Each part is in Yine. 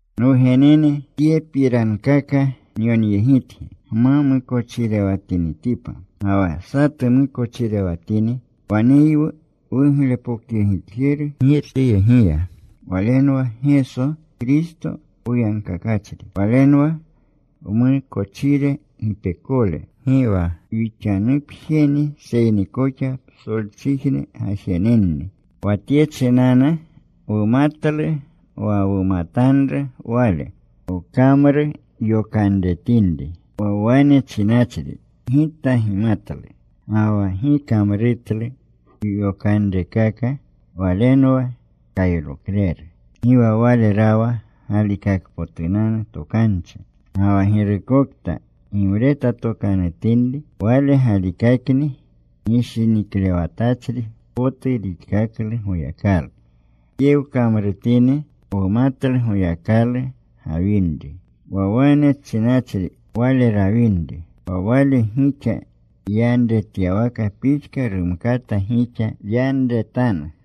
Nwugenene tyepirankaka nyonyegitgi gma mukochirewatinitipa. Ga wa satu mukochirewatini waneywu wuglepokyegitjeru Girchiyegiya. Walenwa Geso Kristo poyagkakachri. Walenwa wmukochire gipekole. Gi wa wixanupjeni seyni koxa psolchijne gajenenni. Wa tye chinanu wumatlu wa wumatanru Wale, wkamrutyokanretinri. Wa wane chinachri, “Gita gimatlu,” ga wa gi kamrutlu yokanrekaka, walenwa kaylokleru. Gi wa wale rawa galikakpotunanu tokanchi. Ga wa girukokta gimretatokanutinri, wale galikakni, gishiniklewatachri potu rixkaklu Goyakalu. Tye wkamrutini wumatlu Goyakalu gawinri. Wa wane chinachri Wale rawinri, wa Wale gixa yanretyawaka pixka rumkata gixa yanreretanu.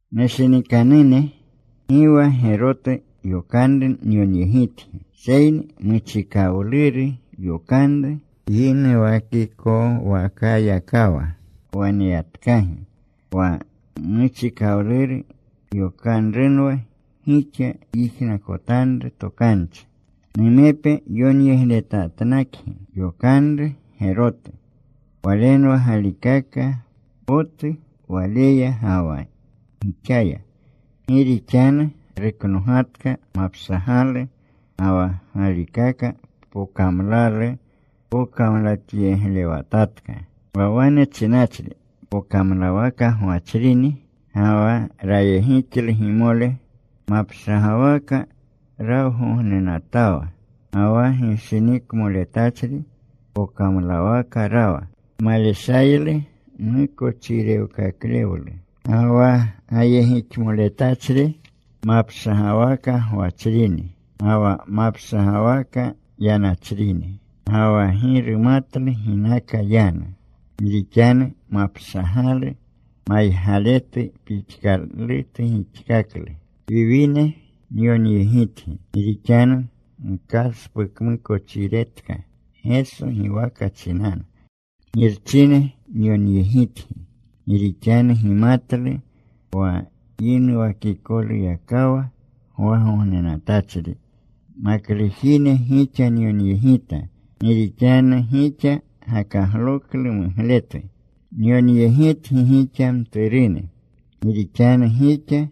Nushinikanune, gi wa gerotu yokanru nyonyegitgi, seyni muchikawluru yokanru yinuwakikowakayakawa waneyatkagi. Wa muchikawluru yokanrunwa wa gixa yijnakotanru tokanchi. Numepe yonyegletatnakgi yokanru gerotu. Walenwa galikaka potu Waleya ga wa gixaya. Gi rixanu ruknogatka mapshagalu ga wa galikaka pokamlalu pokamlatyeglewatatka. Wa wane chinachri pokamlawaka gwachrini ga wa rayegixlu gimole, mapshagawaka rawgognenatawa. Ga wa gishinikmoletachri pokamlawaka rawa. Maleshaylu mukochirewkaklewlu. Ga wa gayegixmoletachri mapshagawaka gwachrini ga wa mapshagawaka yanachrini. Ga wa gi rumatlu ginaka yanu, gi rixanu mapshagalu maygaletu pixkalutu gixkaklu. Wiwine, nyonyegitgi gi rixanu gkaspukmukochiretka Geso giwaka chinanu. Girchine, nyonyegitgi gi rixanu gimatlu wa yinuwakikoluyakawa gwagognenatachri. Maklujine, gixa nyonyegita gi rixanu gixa gakagloklu mugletu. Nyonyegitgi gixa, mturune, gi rixanu gixa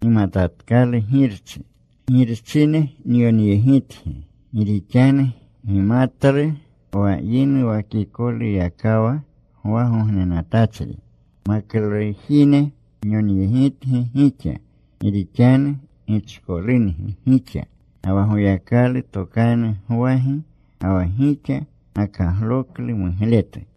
gimatatkalu Girchi. Girchine, nyonyegitgi gi rixanu gimatlu wa yinuwakikoluyakawa gwagognenatachri. Maklujine, nyonyegitgi gixa, gi rixanu gichkolungi gixa, ga wa Goyakalu tokanu gwagi, ga wa gixa gakagloklu mugletu.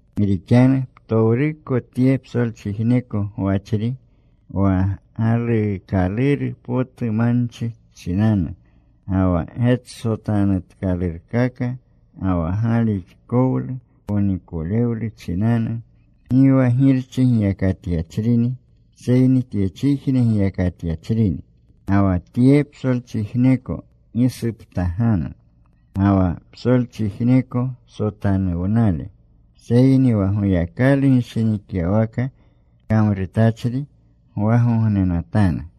Gi rixanu ptowruko tye psolchijneko gwachri, wa galuukaluru potu manchi chinanu, ga wa getsotanutkalurkaka, ga wa galixkowlu ponikolewlu chinanu, gi wa Girchi giyakatyachrini, seyni tyechijne giyakatyachrini. Ga wa tye psolchijneko gisuptaganu, ga wa psolchijneko sotanuwnale, seyni wa Goyakalu gishinikyawaka kamrutachri gwagognenatanu.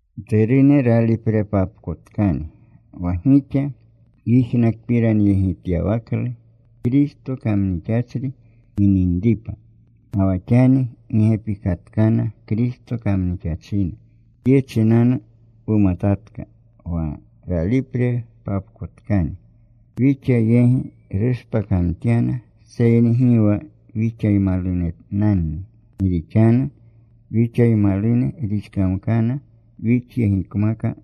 Mturune, raliprepapkotkani. Wa gixa yijnakpiranyegityawaklu Kristo kamnixachri gininripa, ga wa xani gi gepikatkana Kristo kamnixachine. Tye chinanu wumatatka wa raliprepapkotkani. Wixa yegi rushpakamtyana. Seyni gi wa wixaymalunenanni, gi rixanu wixaymalune rixkamkana, wixyegikmaka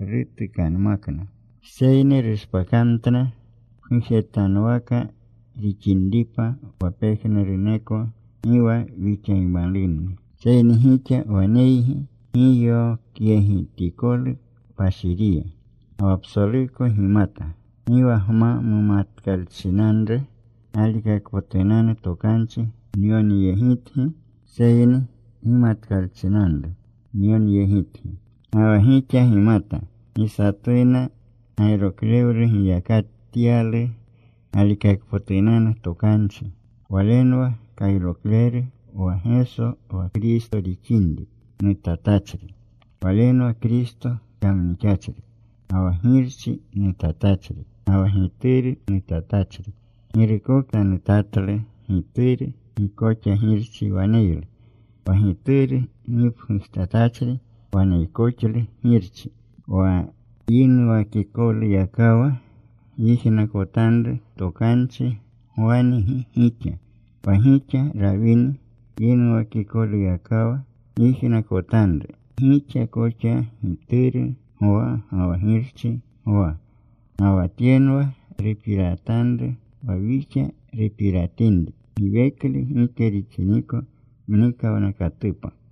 rutukanmakna. Seyni rushpakamtna pgujetanuwaka rixinripa wa pejnuruneko gi wa wixaymalunni. Seyni gixa waneygi giyokyegitikolu Kpashiriya. Ga wa psoluko gimata. Gi wa gma mumatkalchinanru galikakpotunanu tokanchi nyonyegitgi, seyni gimatkalchinanru nyonyegitgi. Ga wa gixa gimata gi satuna gayroklewlu giyakatyalu galikakpotunanu tokanchi. Walenwa kayrokleru, wa Geso wa Kristo rixinri nutatachri. Walenwa Kristo kamnixachri ga wa Girchi nutatachri ga wa Gituru nutatachri. Girukokta nutatlu Gituru, gi koxa Girchi waneylu. Wa Gituru gipgujtatachri waneykoxlu Girchi. Wa yinuwakikoluyakawa gyijnakotanru tokanchi gwangi gixa. Wa gixa rawini yinuwakikoluyakawa gyijnakotanru, gixa koxa Gituru gwa ga wa Girchi gwa. Ga wa tyenwa rupiratanru wa wixa rupiratinri, giweklu gike rixiniko mnikawnakatupa.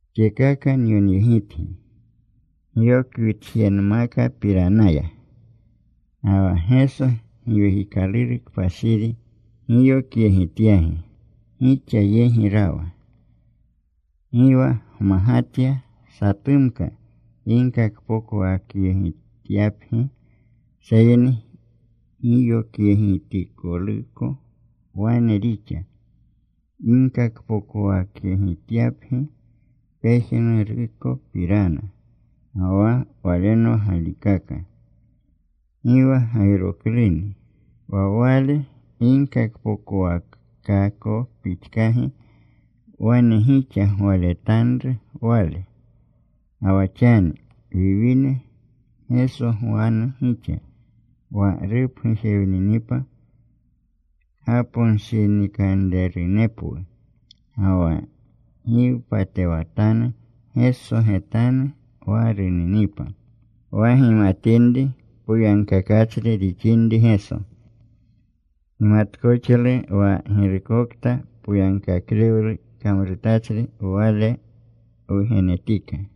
Tyekaka nyonyegitgi gyokwitjenmakapiranaya. Ga wa Geso Giwekikaluru Kpashiri giyokyegityagi gixa yegi rawa. Gi wa gmagatya satumka ginkakpokowakyegityapgi. Seyni giyokyegitikoluko wane rixa ginkakpokowakyegityapgi pejnurukopirana, ga wa Walenwa galikaka. Gi wa gayrokluni. Wa Wale ginkakpokowakako pixkagi, wane gixa gwaletanru Wale. Ga wa xani, wiwine, Geso gwanu gixa, wa rupgujewninipa kgaponshinikanrerunepwu. Ga wa gi wpatewatanu Geso getanu wa runinipa. Wa gimatinri poyagkakachri rixinri Geso, gimatkoxlu wa girukokta poyagkaklewlu kamrutachri Wale wugenetika.